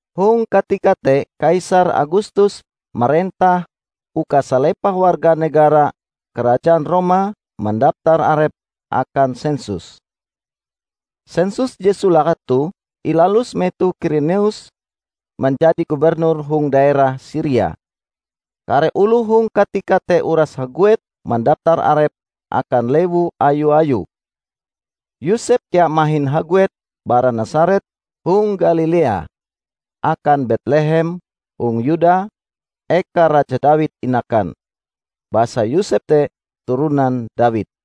Hong katika te kaisar Agustus marentah uka salepah warga negara Karajaan Roma mandaptar arepe akan sensus. Sensus je solake toh ilalus metoh Kirenius manjadi gubernur hong daerah Siria. Kare oloh hong katika te uras haguet mandaptar arepe akan lewu ayu-ayue. Yosep kea mahin haguet bara Nasaret hong Galilea, akan Betlehem hong Yuda, eka Raja Dawid inakan; basa Yosep te turonan Dawid.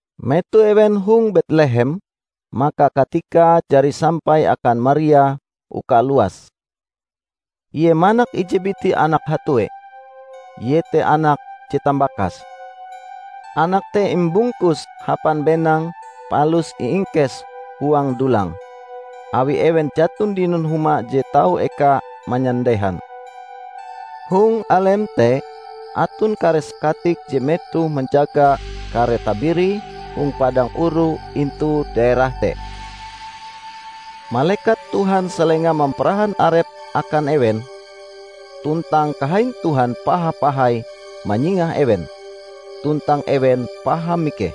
Metoh ewen hong Betlehem maka katikae jari sampai akan Maria uka luas. Ie manak ije biti anak hatue, iete anak je tambakase. Anak te imbungkuse hapan benang palus iingkese huang dulang, awi ewen jaton dinon huma je tau eka manyandehan. Hong alem te aton kare sakatik je metohe manjaga kare tabirie hong padang oru intu daerah te. Malekat Tuhan salenga mamparahan arepe akan ewen, tuntang kahain Tuhan paha-pahai manyingah ewen, tuntang ewen paham mikeh.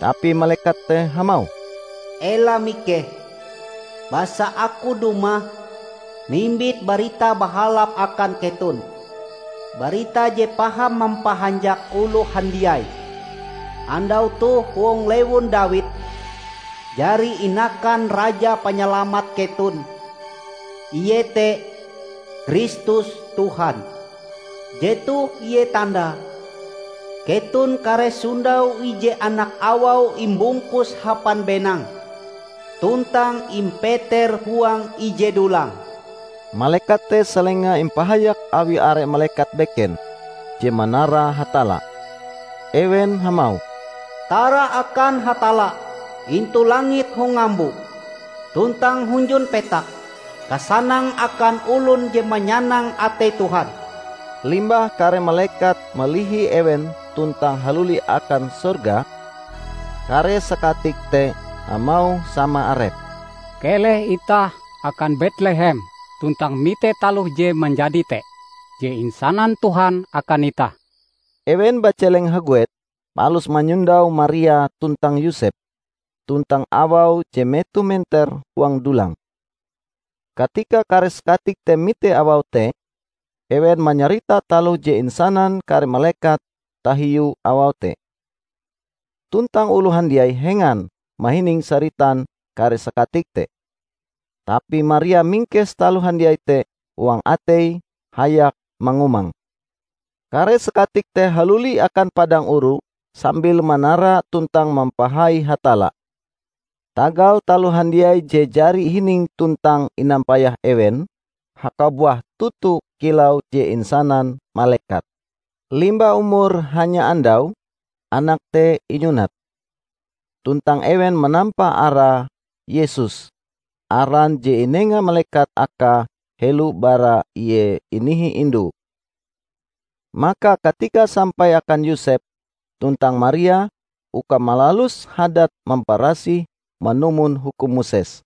Tapi malekat te hamauh, "Ela mikeh! Basa aku dumah mimbit barita bahalap akan keton -- barita je paham mampahanjak oloh handiai. Andau toh hong lewun Dawid jari inakan Raja Panyalamat keton iete Kristus Tuhan. Jetoh ie tandae: keton kareh sondau ije anak awau imbungkus hapan benang, tuntang impeter huang ije dulang." Malekat te salenga impahayak awi are malekat beken, je manara Hatalla. Ewen hamauh, "Tara akan Hatalla intu langit hong ngambo! tuntang hunjun petak, kasanang akan olon je manyanang atei Tuhan!" Limbah kare malekat malihi ewen tuntang haluli akan sorga, kare sakatik te hamauh sama arepe, "Keleh itah akan Betlehem tuntang mite taloh je manjadi te, je insanan Tuhan akan itah." Ewen bajeleng haguet, palus manyondau Maria tuntang Yosep, tuntang awau je metoh menter huang dulang. Katika kare sakatik te mite awau te, ewen manyarita taloh je insanan kare malekat tahiu awau te. Tuntang oloh handiai hengan mahining saritan kare sakatik te. Tapi Maria mingkes taloh handiai te huang ateie hayak mangumange. Kare sakatik te haluli akan padang oru sambil manara tuntang mampahai Hatalla, tagal taloh handiai je jari ihining tuntang inampayah ewen, hakabuah toto kilau je insanan malekat. Limbah umur hanya andau, anak te inyunat. Tuntang ewen manampa arae Yesus, aran je inenga malekat akae helo bara Ie inihi indue. Maka katikae sampai akan Yosep tuntang Maria uka malalus hadat mamparasih manumon hukum Moses.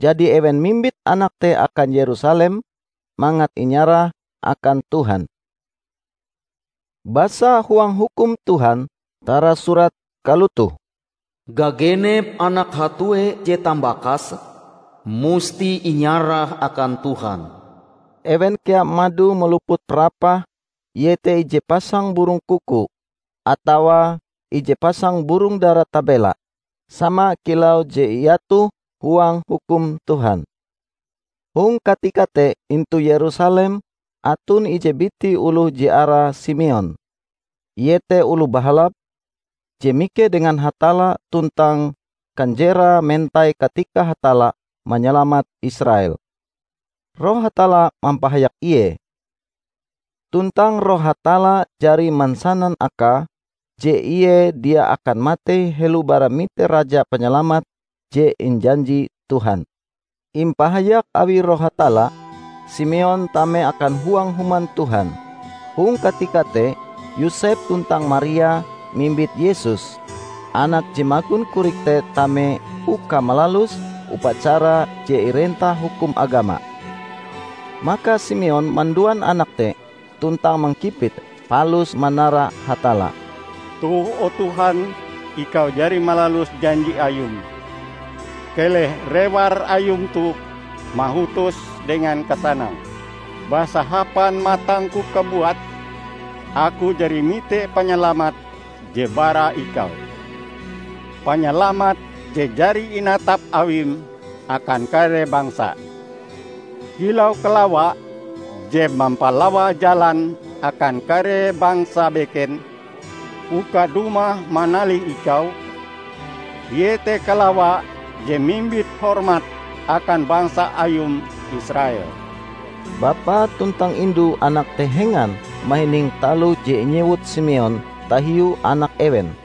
Jadi, ewen mimbit anak te akan Yerusalem mangat inyarah akan Tuhan. Basa huang Hukum Tuhan tarasurat kalotoh, "Gagenep anak hatue je tambakase, musti inyarah akan Tuhan." Ewen kea mado maluput parapah iete ije pasang burong kuku atawa ije pasang burong dara tabela, sama kilau je iatoh huang Hukum Tuhan. Hong katika te intu Yerusalem aton ije biti oloh je arae Simeon. Ie te oloh bahalap, je mikeh dengan Hatalla tuntang kanjerae mentai katikae Hatalla manyalamat Israel. Roh Hatalla mampahayak ie, tuntang roh Hatalla jari mansanan akae, je ie dia akan matei helo bara mite Raja Panyalamat je injanji Tuhan. Impahayak awi Roh Hatalla, Simeon tame akan huang Human Tuhan. Hong katika te Yosep tuntang Maria mimbit Yesus, anak je magon korik te tame uka malalus upacara je irentah hukum agama. Maka Simeon manduan anak te tuntang mangkipite, palus manara Hatalla, "Toh o Tuhan Ikau jari malalus janji Ayum. Keleh rewar Ayum toh mahutos dengan kasanang. Basa hapan matangku kabuat aku jari mite Panyalamat je bara Ikau. Panyalamat je jari inatap Awim akan kare bangsa: Kilau kalawa je mampalawa jalan akan kare bangsa beken, uka dumah manalih Ikau; iete kalawa je mimbit hormat akan bangsa Ayum Israel." Bapa tuntang indu anak te hengan mahining taloh je inyewut Simeon tahiu anak ewen.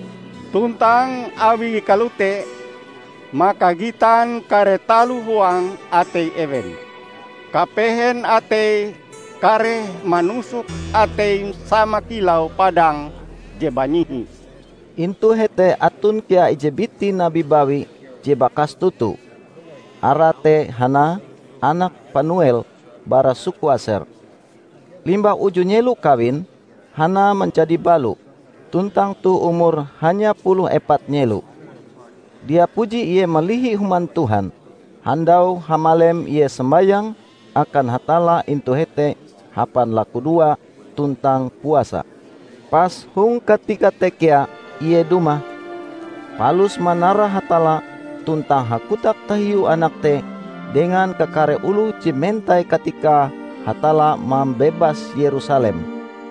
tuntang awie kalote maka gitan kare taloh huang atei ewen. Kapehen atei kareh manusok ateim sama kilau padang je banyihi." Intu hete aton kea ije biti nabi bawi je bakas toto. arae te Hana, anak Panuel, bara suku Aser. Limbah uju nyelo kawin, Hana manjadi balo, tuntang toh umure hanya puluh epat nyelo. Dia puji ie malihi Human Tuhan. Handau-hamalem ie sombayang akan Hatalla intu hete hapan lakudoa tuntang puasa. Pas hong katika te kea ie dumah, palus manara Hatalla tuntang hakotak tahiu anak te dengan kakare oloh je mentai katikae Hatalla mambebas Yerusalem.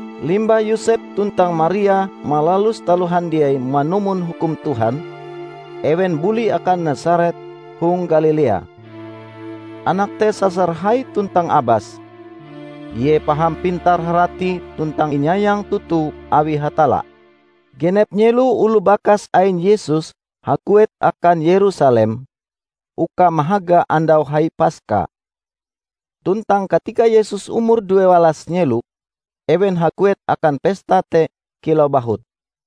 Limbah Yosep tuntang Maria malalus taloh handiai manumon Hukum Tuhan, ewen buli akan Nasaret hong Galilea. Anak te sasar hai tuntang abas. Ie paham pintar harati tuntang inyayang toto awi Hatalla. Genep nyelo oloh bakas ain Yesus haguet akan Yerusalem uka mahaga Andau Hai Paska. Tuntang katika Yesus umur duewalas nyelo, ewen haguet akan pesta te kilau bahut.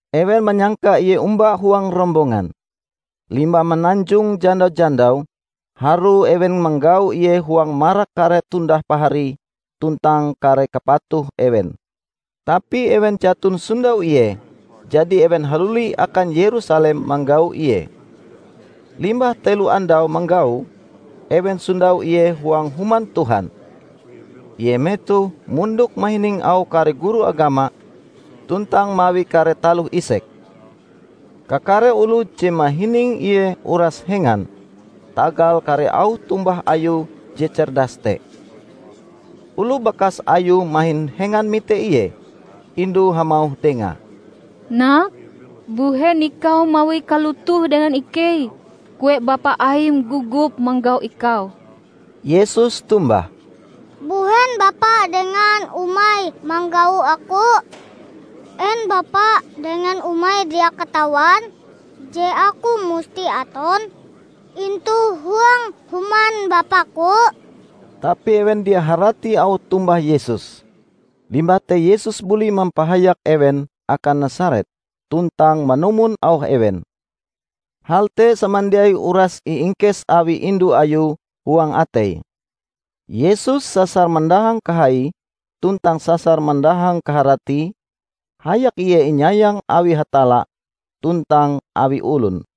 Ewen manyangka Ie omba huang rombongan. Limbah mananjong janda-jandau, harue ewen manggau Ie huang marak kare tundah paharie tuntang kare kapatuh ewen. Tapi ewen jaton sondau Ie, jadi ewen haluli akan Yerusalem manggau Ie. Limbah telo andau manggau, ewen sondau ie huang Human Tuhan. Ie metohe mondok mahining auh kare guru agama tuntang mawi kare taloh isek. Kakare oloh je mahining Ie uras hengan tagal kare auh tombah Ayue je cerdas te. Oloh bakas Ayue mahin hengan mite Ie. Indue hamauh Dengae, "Nak, mbuhen Ikau mawie kalotoh dengan ikei? Kue bapa Aim gogop manggau Ikau!" Yesus tombah, "Mbuhen bapa dengan umai manggau Aku? En bapa dengan umai dia katawan je Aku musti aton intu huang human Bapa-Ku?" Tapi ewen dia harati auh tombah Yesus. Limbah te Yesus buli mampahayak ewen akan Nasaret, tuntang manumon auh ewen. Hal te samandiai uras iingkes awi indu Ayue huang ateie. Yesus sasar mandahang kahaie tuntang sasar mandahang kaharatie, hayak ie inyayang awi Hatalla tuntang awi olon.